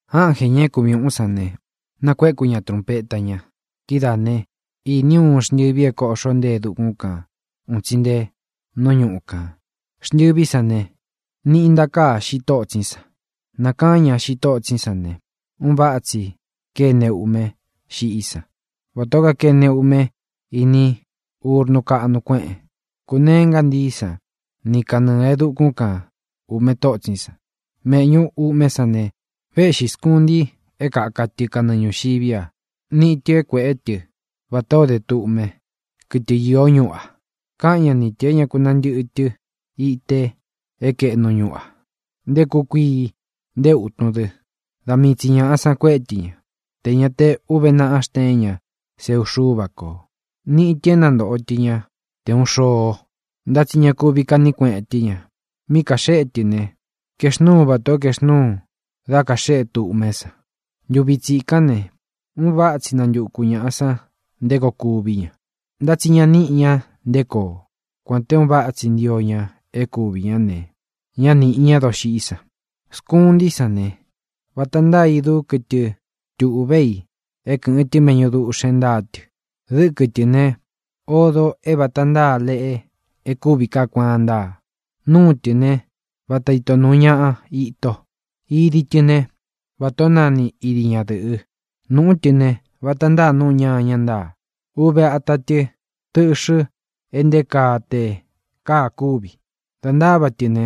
Ánjē, ña é kuvi ūꞌún san ne, nakuéku ña trūnpeta ña. Kidáā né, īní u uun xntɨvi é kōꞌxó nte e dukún kān un tsi nte nú ñuꞌu kān. Xntɨví san ne, niꞌi ntakāá xiꞌi tótsín san. Nākaán ña xiꞌi tótsín san ne, un váꞌa tsi kéne uꞌme xiꞌí san, vatā ó kakene uꞌme ini úrnu káꞌnu kueꞌen. Kūneé ngántií san ni kanɨɨ̄ e dukún kan ūꞌme tótsín san. Méꞌñū uꞌmé san ne, véꞌxī skunti é kaka tɨ kanɨɨ ñūxiví a. Níꞌi tɨ̄ é kuēꞌé tɨ vatā ó de tduꞌme, kɨtɨ īó ñuꞌu a. Káꞌan ña ni tɨ̄ é ña ku nantɨꞌɨ tɨ ite é kaeꞌnu ñuꞌu a, nté kūꞌu kuii, nté ūtun dɨ. Da mii tsi ñāꞌa san kuéꞌe tɨ ña, tē ña te uve náꞌa xteén ña seu Xúva kō. Níꞌi tɨ̄ é nantoꞌo tɨ ña te ūꞌun xoo, ntá tsi ña kuvi kaꞌní kueꞌen tɨ́ ña. Mí kaxéꞌe tɨ ne, kaexnúu vatā ó kaexnúu da kaxéꞌe tduꞌmé san. Ntuvi tsikán ne, un váꞌa tsi nantuku ñāꞌa san nté koo kuví ña, ntá tsi ña níꞌi ña nté koo. Kuān te un váꞌa tsi ntio ña é kuvī ñá ne, ñá nīꞌi ñá doxiꞌí san. Skuntí san ne, vata ntáa idú kɨtɨ tuꞌvé i é kɨ̄ꞌɨn tɨ méꞌñu duꞌxēn ntáa tɨ. Dɨ́kɨ tɨ̄ ne, odo é vata ntáa leꞌe e kúvi kaá kuaan ntáa. Núu tɨ̄ ne, vata ito nuu ñaꞌa ito. Idi tɨ ne, vatā ó nani idi ñadɨ̄ꞌɨ. Nūꞌú tɨ ne, vata ntáa nuꞌu ñaña ntáa. Uve ata tɨ tdɨꞌxɨ e nté kaa te káa kúvi. Dā ntáva tɨ ne,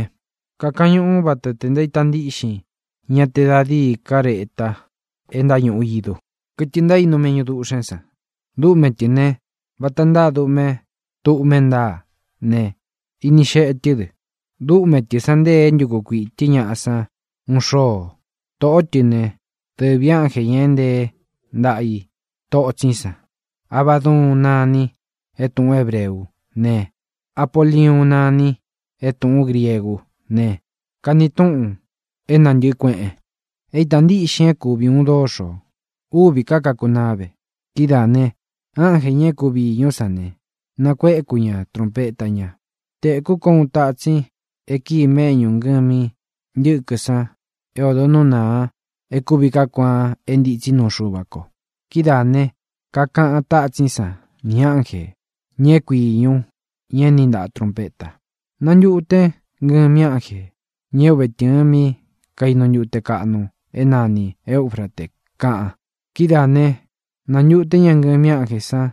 kakañuꞌu vata te ntaíta ntiꞌxin ña te da díi kareta e ntáñuꞌu idú, kɨtɨ ntaínu méꞌñu duꞌxēn san. Dúꞌme tɨ̄ ne, vata ntáa duꞌme tdúꞌme ntáa ne, ini xeꞌe tɨ́ dɨ. Dúꞌme tɨ̄ san ntée é ntuku kuiꞌī tɨ́ ñaꞌa san úꞌun xoo. Tōꞌó tɨ ne, dɨvī ánjē, ña e ntée ntaꞌa i totsín san. Abaduun nani é tūꞌun hébreú ne, Apoliuun nani é tūꞌún griegú ne, kani túꞌun “é nantɨ̄ꞌɨ kueꞌen”. É īta ntíꞌxin é kuvi ūun dóxō. Úvī ká kakunaá ve. Kidáā ne, ánjē, ña é kuvi īñú san ne, nakuéku ña trūnpeta ña. Tēkú ko uun tatsin í e kíi méꞌñū ngɨmi ntɨ́kɨ san é ōdo nú nāa e kúvi kaá kuaan é ntitsí nuu Xuva ko. Kídaā ne, kakaꞌan tátsín san nī ánjē, ña é kui īñu, ña é niꞌi ntaꞌa trunpeta: —Nantuten ngɨmi ánjē, ña é uve tɨ̄ɨn mí kainu ntute kaꞌnu é nani Eūfrate —kaꞌan. Kidáā né, nāntuté ña ngɨmi ánjē san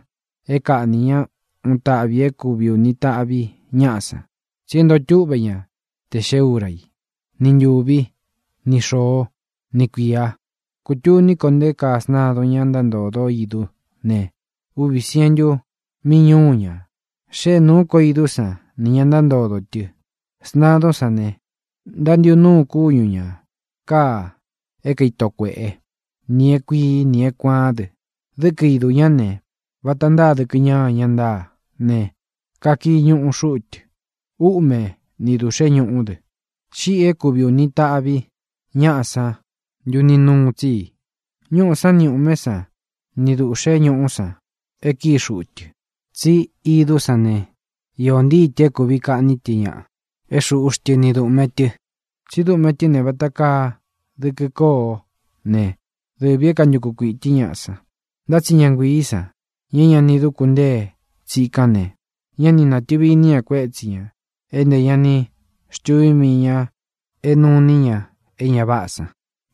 é kaꞌnī ñá uun taꞌvi i é kuvi ūni taꞌvi ñaꞌá san, tsi é ntoo túꞌvē ñá tē xee úra i, ni ntūví, ni xōó, ni kuīa. Kūtuní ko nté kaa sntadun, ña ntántōdó idú ne, uvī sientu míñuu ña. Xée nūú ko idú san nī ña ntántodō tɨ. Sntadún san ne, ntántiꞌu núu kúñu ñā káa é kaito kuēꞌé, nī é kuīí, nī é kuāán dɨ. Dɨ́kɨ idū ñá ne, vata ntáa dɨkɨ ñáña ntáa ne, kakii ñuꞌu xúꞌu tɨ. Úꞌme ni dūꞌxé ñuꞌu dɨ. Xíꞌi uun tāꞌvi i é kuvi ūni taꞌvi ñaꞌá san ntuni núu tsi i: ñuꞌú san ni ūꞌmé san ni dūꞌxé ñuꞌú san e kíi xuꞌu tɨ. Tsí idú san ne, īó ntii tɨ̄ é kuvi kaꞌní tɨ ñaꞌa é xūꞌu xtɨ́ ni dūꞌme tɨ. Tsí duꞌme tɨ́ ne, vata kaa dɨkɨ kóo ne, dɨvī é kantuku kuiꞌī tɨ́ ñaꞌa san. Ntá tsi ña nguiī san, ña é ña ni duku ntée tsikán ne, ñá ni natɨ̄vi iní ña kuétsi ñā é ntē ña ni xtuví mii ñā é nuu iní ña é ña váꞌā san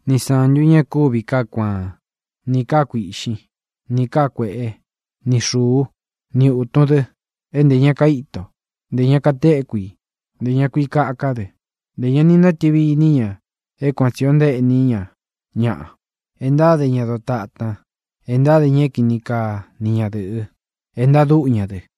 ni sántu ñā e kúvi kaá kuaán, nī káa kuīꞌxín, nī káa kuēꞌé, ni xūú, ni ūtun dɨ, é ntē ña kaíto, ntē ña katéku i, ntē ña kui kaká dɨ. Ntē ña ni nátɨvi iní ña é kuān tsi o ntaéꞌní ña ñaꞌa, e ntáde ña dotatan, e ntáde ña é kini kaa ni ñadɨ̄ꞌɨ, e ntadúꞌu ña dɨ.